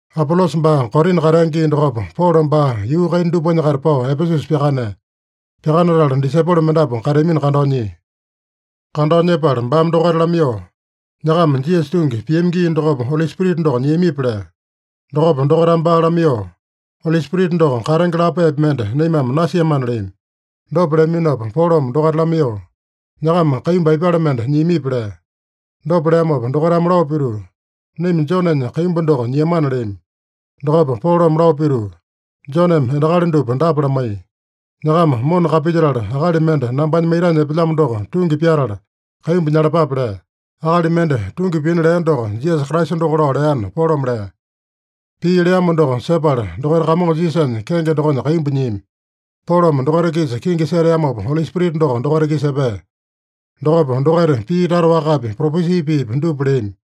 Apolosa baa Korina katea gii dokopa, Polo baa yuu kaina dupanya-kaita pao Epesusa pyakanea. Pyakanatala disaipolo mendapu kateamino kandao nyia. Kandao nyepala baame dokaita lamaiyoo, “Nyakama Jisasa tungi piami gii dokopa Oli Spirita doko nyiamipi?” lea. Dokopa dokaitame baa lamaiyoo, “Oli Spirita doko katenge lapaepi mende naimame nasiamana” leami. Dopa leaminopa Polome dokaita lamaiyoo, “Nyakama kaimbu aipale mende nyiamipi?” lea. Dopa leamopa dokaitame lao pituu, “Naima Jonenya kaimbu doko nyiamana” leami. Dokopa Polome lao pituu, “Joneme endakali dupa dapa lamaiya: ‘Nyakama mona kapilyetala, akali mende nambanya maitanya epelyamo doko tungi pyatala, kaimbu nyalapape’ lea. Akali mende tungi pina lea doko Jisasa Kraisa doko lao leana” Polome lea. Pii leamo doko sepala dokaita Kamongo Jisasanya kenge dokonya kaimbu nyiami. Polome dokaita-kisa kingi seteamopa, Oli Spirita doko dokaita-kisa epea. Dokopa dokaita pii tata wakapi, propesi piipi dupa leami.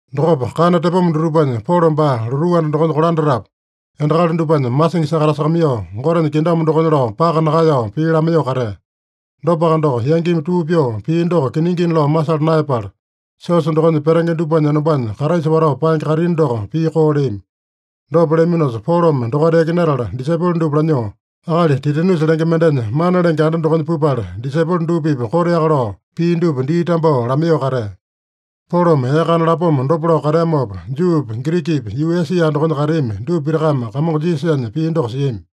Dokopa kana tepoma dutupanya Polo baa lotuu anda dokonya kolandatapu, endakali dupanya masingi sakatasakamaiyoo, Gotenya kingdom dokonya lao paka nakaeyao pii lamaiyoo katea. Dopaka doko, yangimi tuu pyoo pii doko kiningina lao masala naeyapala, siosa dokonya petenge dupanya enombanya Kraisa watao paenge kaitini doko pii koo leami. Dopa leaminosa, Polome dokaita yakinatala, disaipolo dupa lanyoo akali Titanusa lenge mendenya mana lenge anda dokonya pupala, disaipolo dupa-pipa koteaka lao pii dupa dii tambao lamaiyoo katea. Polome ee kana lapoma dopa lao kateamopa, Juupi, Girikipi, yuu Esia dokonya kateami dupa pitakame Kamongo Jisasanya pii doko siami.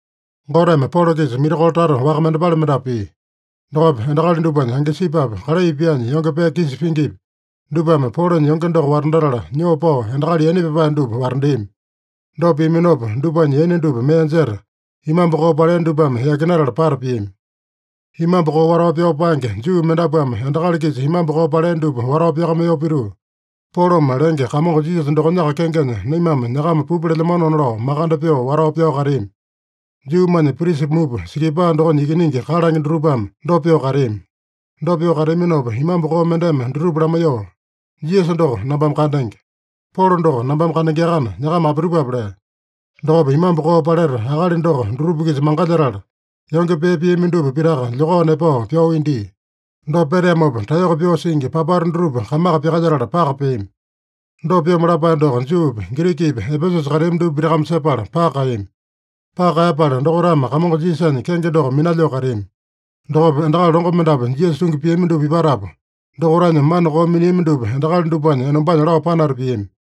Goteme Polo-kisa mirakolo tata waka mendepale mendapu pia. Dokopa endakali dupanya angisipupi, kalai pyaanya yonge pee kisa pingipi, dupame Polonya yonge doko watandatala, nyoo pao endakali yaina pyapae dupa watandeami. Dopa piaminopa, dupanya yaina dupa mee jeta, imambu koo palea dupame yakinatala pata piami. Imambu koo watao pyao paenge Juu mendapuame endakali-kisa imambu koo palea dupa watao pyakamaiyoo pituu, “Polome lenge Kamongo Jisasa dokonyaka kengenya naimame nyakama pupa lelyamanona” lao makande pyoo watao pyao kateami. Juumanya prisa mupa Sikipaa dokonya ikiningi kalange dutupame dopa pyoo kateami. Dopa pyoo kateaminopa imambu koo mendeme dutupa lamaiyoo, “Jisasa doko nambame kandenge. Polo doko nambame kandengeakana, nyakama apitupape?” lea. Dokopa imambu koo paleta akali doko dutupa-kisa mangalyetala, yonge pee piami dupa pitaka lyokao nepao pyao india. Dopa peteamopa, taeyoko pyoo singi papata dutupa kamaka pyakalyetala paka peami. Dopa pyomo lapae doko Juupi, Girikipi, Epesusa kateami dupa pitakame sepala paka kaeyami. Paka kaeyapala dokaitame Kamongo Jisasanya kenge doko minalyoo kateami. Dokopa endakali longo mendapu Jisasa tungi piami dupa ipatapu, dokaitanya mana koo miniami dupa endakali dupanya enombanya lao panata piami.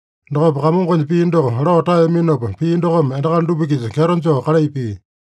Dokopa Kamongonya pii doko lao taeyaminopa, pii dokome endakali dupa-kisa kyeto joo kalai pia.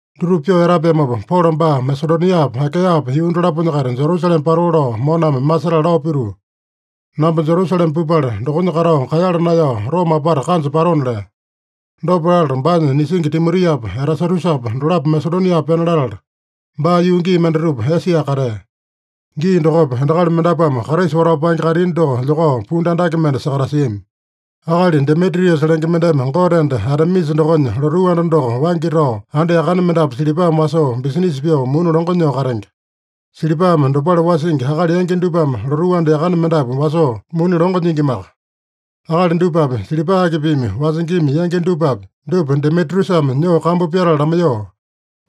Dutupa pyoo etapeamopa, Polo baa Masedoniapa, Akaeyapa yuu dolaponya-kaita Jerusalema patoo lao moname masetala lao pituu, “Namba Jerusalema pupala, dokonya katao kaeyala naeyao Roma apata kanja patona” lea. Dopa latala, baanya nisingi Timotiapa, Erasatusapa dolapo Masedonia pena latala, baa yuu gii mendatupa Esia katea. Gii dokopa, endakali mendapuame Kraisa watao paenge kaitini doko lyokao pundu andake mende sakatasiami. Akali Demitriusa lenge mendeme gote enda Atemisa dokonya lotuu anda doko waingi tao anda yakane mendapu silipame wasoo, bisinisa pyoo muni longo nyoo katenge. Silipame dopale wasingi akali yangi dupame lotuu anda yakane mendapu wasoo muni longo nyingimaka. Akali dupapi, silipa akipimi wasingima yangi dupapi, dupa Demitriusame nyoo kambu pyatala lamaiyoo,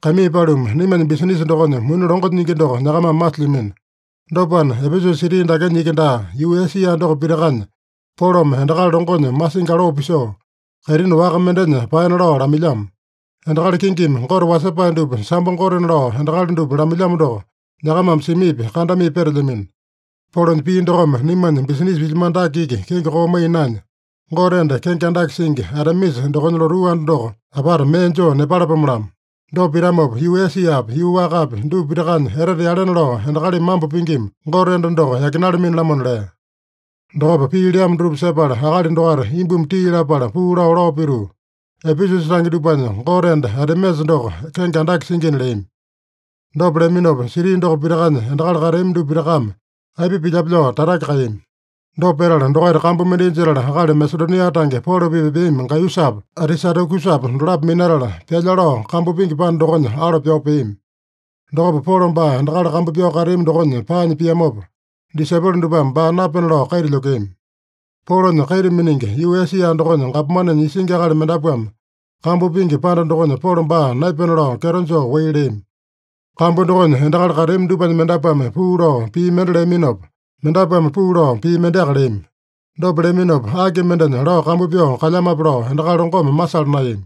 “Kaimii paluma, naimanya bisinisa dokonya muni longo nyingi doko nyakamame masilyamino. Dopana, Epesusa siti dakenya iki daa, yuu Esia doko pitakanya Polome endakali longonya masingi aloo pisoo, kaitini waka mendenya paena lao lamailyamo. Endakali kingimi gote wasepae dupa sambo gotena lao endakali dupa lamailyamo doko, nyakamame simipi, kandamipi petelyamino. Polonya pii dokome naimanya bisinisa pilyamano dake iki kenge koo maiya naenya, gote enda kenge andake singi Atemisa dokonya lotuu anda doko apata mee joo nepalapome-lamo. Dopa pitamopa, yuu Esiapi, yuu wakapi, dupa pitakanya etete yalena lao endakalimi mambo pingima gote enda doko yakinalamini-lamona” lea. Dokopa pii leamo dutupa sepala, akali dokaita imbumi tii lapala puu lao, lao pituu, “Epesusa tange dupanya gote enda Atemisa doko kenge andake singina” leami. Dopa leaminopa, siti doko pitakanya endakali kateami dupa pitakame aipa pilyape lao tatake kaeyami. Dopa petala, dokaita kambu mendai jetala, akali Masedonia tange Polo-pipa epeami Gaiyusapa, Atisatakusapa dolapo minatala, pyalya lao kambu pingi panda dokonya alo pyao peami. Dokopa Polo baa endakali kambu pyao kateami dokonya paanya piamopa, disaipolo dupame baa napena lao kaita lyokeami. Polonya kaita miningi, yuu Esia dokonya gapomanenya isingi akali mendapuame kambu pingi panda dokonya Polo baa naepena lao kyeto joo wai leami. Kambu dokonya endakali kateami dupanya mendapuame puu lao pii mende leaminopa, mendapuame puu lao pii mendeaka leami. Dopa leaminopa, aki mendenya lao kambu pyao kalyamape lao endakali longome masala naeyami.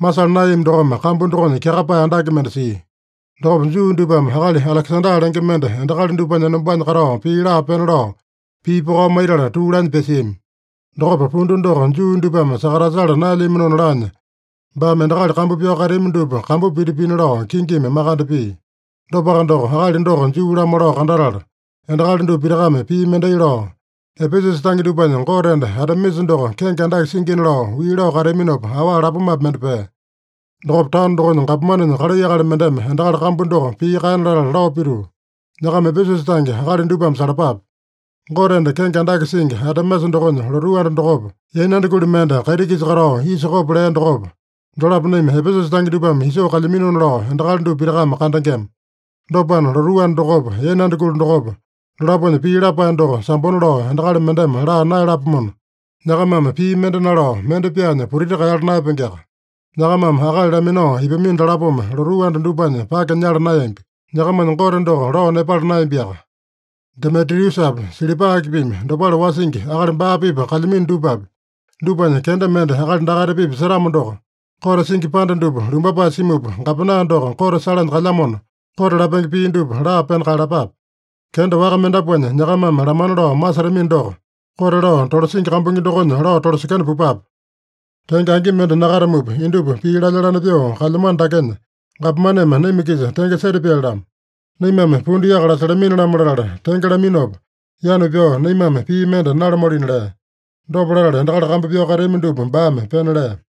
Masala naeyami dokome kambu dokonya kyakapae andake mende sia. Dokopa Juu dupame akali Alekesanda lenge mende endakali dupanya enombanya katao pii laa pena lao, pii pokao maitala tuu laanya pyasiami. Dokopa, pundu doko Juu dupame sakatasala naelyaminona laanya, baame endakali kambu pyao kateami dupa kambu piti pina lao kingimi makande pia. Dopaka doko, akali doko Juu-lamo lao kandatala, endakali dupa pitakame pii mendai lao, “Epesusa tange dupanya gote enda Atemisa doko kenge andake singina” lao wii lao kateaminopa, awa lapomapi mende pea. Dokopa taono dokonya gapomanenya kalai akali mendeme endakali kambu doko pii kaena latala lao pituu, “Nyakama Epesusa tange akali dupame salapape. Gote enda kenge andake singi Atemisa dokonya lotuu anda dokopa, yainanda kuli mende kaiti-kisa katao isa kopo lea dokopa, dolapo naima Epesusa tange dupame isoo kalyaminona lao endakali dupa pitakame kandengema. Dopana, lotuu anda dokopa, yainanda kuli dokopa, dolaponya pii lapae doko sambona lao endakali mendeme laa naeyalapomona, nyakamame pii mende nalao, mende pyaanya putiti kaeyala naeyapengeaka. Nyakamame akali laminao ipamino dalapome lotuu anda dupanya pake nyala naeyambi. Nyakamanya gote doko lao nepala naeyambiaka. Demitriusapi, silipa akipimi dopale wasingi akali baa-pipa kalyamino dupapi, dupanya kenda mende akali dakaita-pipa setamo doko, kote singi panda dupa lumbapae simupa, gapena doko kote salanya kalyamona, kote lapenge pii dupa laa pena kaeyalapape. Kenda waka mendapuanya nyakamame lamana lao masetamino doko, kote lao tolasingi kambuingi dokonya lao tolasekena pupape. Tenge angi mende nakatamupa, indupa pii lalya-lane pyoo kalyamano dakenya, gapomaneme naima-kisa tenge setapyali-lamo. Naimame pundu yaka lasalamini-lamo latala tenge laminopa, yanu pyao naimame pii mende nalamualina” lea. Dopa latala, endakali kambu pyao kateami dupa baame pena lea.